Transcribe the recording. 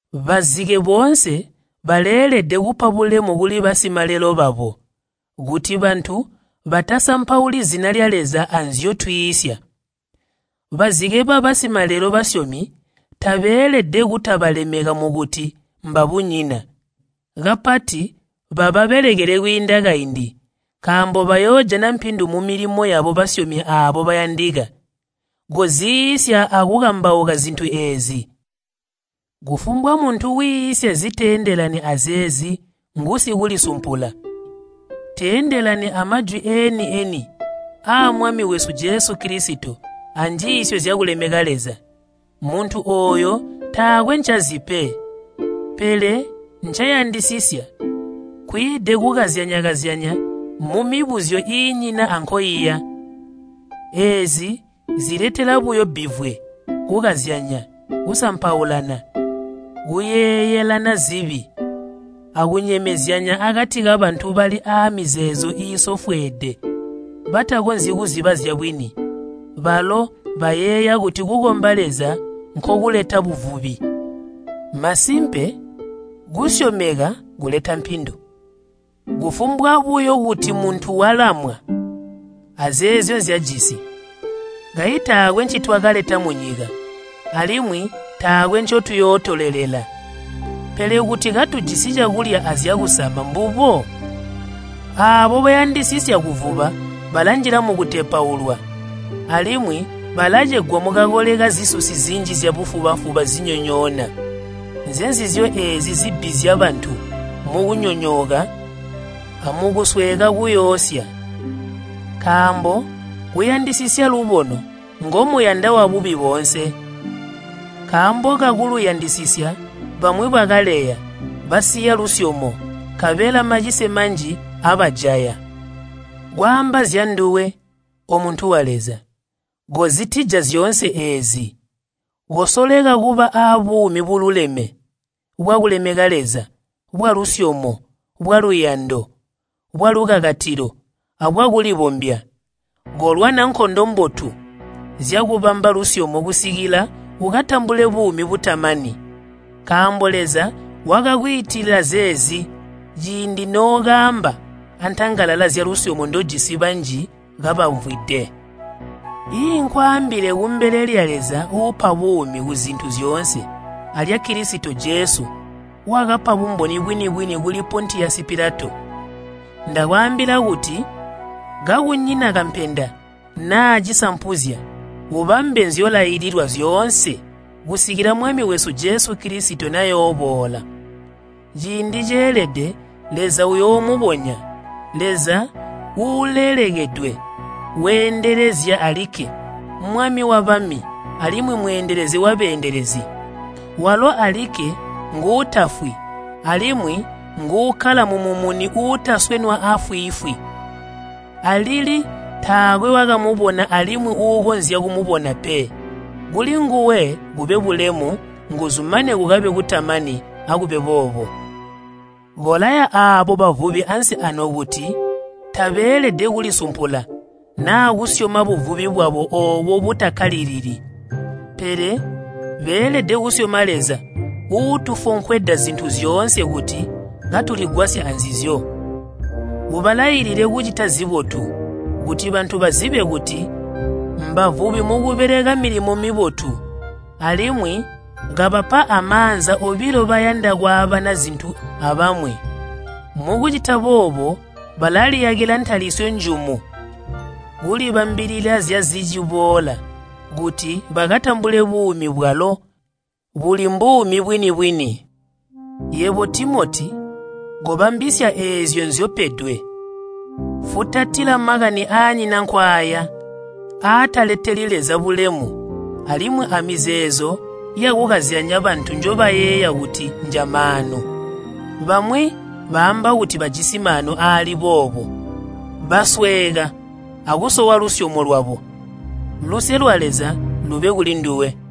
Bazike boonse baleelede kupa bulemu kuli basimalelo babo, kuti bantu batasampauli zina lya Leza anzyotwiisya. Bazike babasimalelo basyomi, tabeelede kutabalemeka mukuti mbabunyina. Kapati bababelekele kwiinda kaindi, nkaambo bayoojana mpindu mumilimo yabo basyomi aabo bayandika. Zyanjiisyo Zyakubeja Koziiisya akukambauka zintu eezi. Kufumbwa muntu wiisya ziteendelani azeezi ngusikulisumpula. Teendelani amajwi eeni-eni aa Mwami wesu Jesu Kilisito anjiisyo zyakulemeka Leza. Muntu ooyo taakwe ncazi pe. Pele ncayandisisya nkwiide kukazyanya-kazyanya mumibuzyo iinyina ankoiya. Eezi ziletela buyo bbivwe, kukazyanya, kusampaulana, kuyeeyelana zibi, akunyemezyanya akati kabantu bali aamizeezo iisofweede, batakonzyi kuziba zyabwini. Balo bayeeya kuti kukomba Leza nkokuleta buvubi. Masimpe kukomba Leza kuleta mpindu, kufumbwa buyo kuti muntu walamwa azeezyo nzyajisi. Kayi taakwe ncitwakaleta munyika, alimwi taakwe ncotuyootolelela. Pele kuti katujisi cakulya azyakusama mbubo. Aabo bayandisisya kuvuba balanjila mukutepaulwa, alimwi balacegwa mukakole kazisusi zinji zyabufuba-fuba zinyonyoona. Nzenzizyo eezi zibbizya bantu mukunyonyooka amukusweeka kuuyosya. Nkaambo kuyandisisya lubono ngomuyanda wabubi boonse. Nkaambo kakuluyandisisya, bamwi bakaleya, basiya lusyomo, nkabela macise manji abajaya. Kwaamba zyanduwe, omuntu wa Leza, kozitija zyoonse eezi. Kosoleka kuba abuumi bululeme, bwakulemeka Leza, bwalusyomo, bwaluyando, bwalukakatilo, abwakulibombya. Kolwana nkondo mbotu zyakubamba lusyomo kusikila ukatambule buumi butamani. Nkaambo Leza wakakwiitila zeezi ciindi nookaamba antangalala zyalusyomo ndojisi banji kabamvwide. Iinkwaambile kumbele lya Leza uupa buumi kuzintu zyoonse alya Kilisito Jesu wakapa bumboni bwini-bwini kuli Pontiyasi Pilato. Ndakwaambila kuti, kakunyina kampenda naa cisampuzya, ubambe nzyolaililwa zyoonse kusikila Mwami wesu Jesu Kilisito nayooboola. Ciindi ceelede Leza uyoomubonya, Leza uulelekedwe weendelezya alikke, Mwami wabami alimwi Mweendelezi wabeendelezi. Walo alikke nguutafwi alimwi nguukkala mumumuni uutaswenwa afwiifwi. Alili taakwe wakamubona alimwi uukonzya kumubona pe. Kulinguwe kube bulemu, nguzu mane kukabe kutamani. Akube boobo. Kolaya aabo bavubi ansi aano kuti tabeelede kulisumpula naa kusyoma buvubi bwabo oobo butakkalilili. Pele beelede kusyoma Leza uutufonkweda zintu zyoonse kuti katuligwasya anzizyo. Ubalailile kucita zibotu, kuti bantu bazibe kuti mbavubi mukubeleka milimo mibotu, alimwi kabapa amaanza obilo bayanda kwaabana zintu abamwi. Mukucita boobo balaliyakila ntalisyo njumu kulibambilila zyaaziciboola kuti bakatambule buumi bwalo buli mbuumi bwini-bwini. Yebo Timoti kobambisya eezyo nzyopedwe. Futatila makani aanyina nkwaaya, aataleteli Leza bulemu alimwi amizeezo yakukazyanya bantu njobayeeya kuti njamaanu. Bamwi baamba kuti bajisi maanu aali boobo, basweeka akusowa lusyomo lwabo. Luse lwa Leza lube kulinduwe.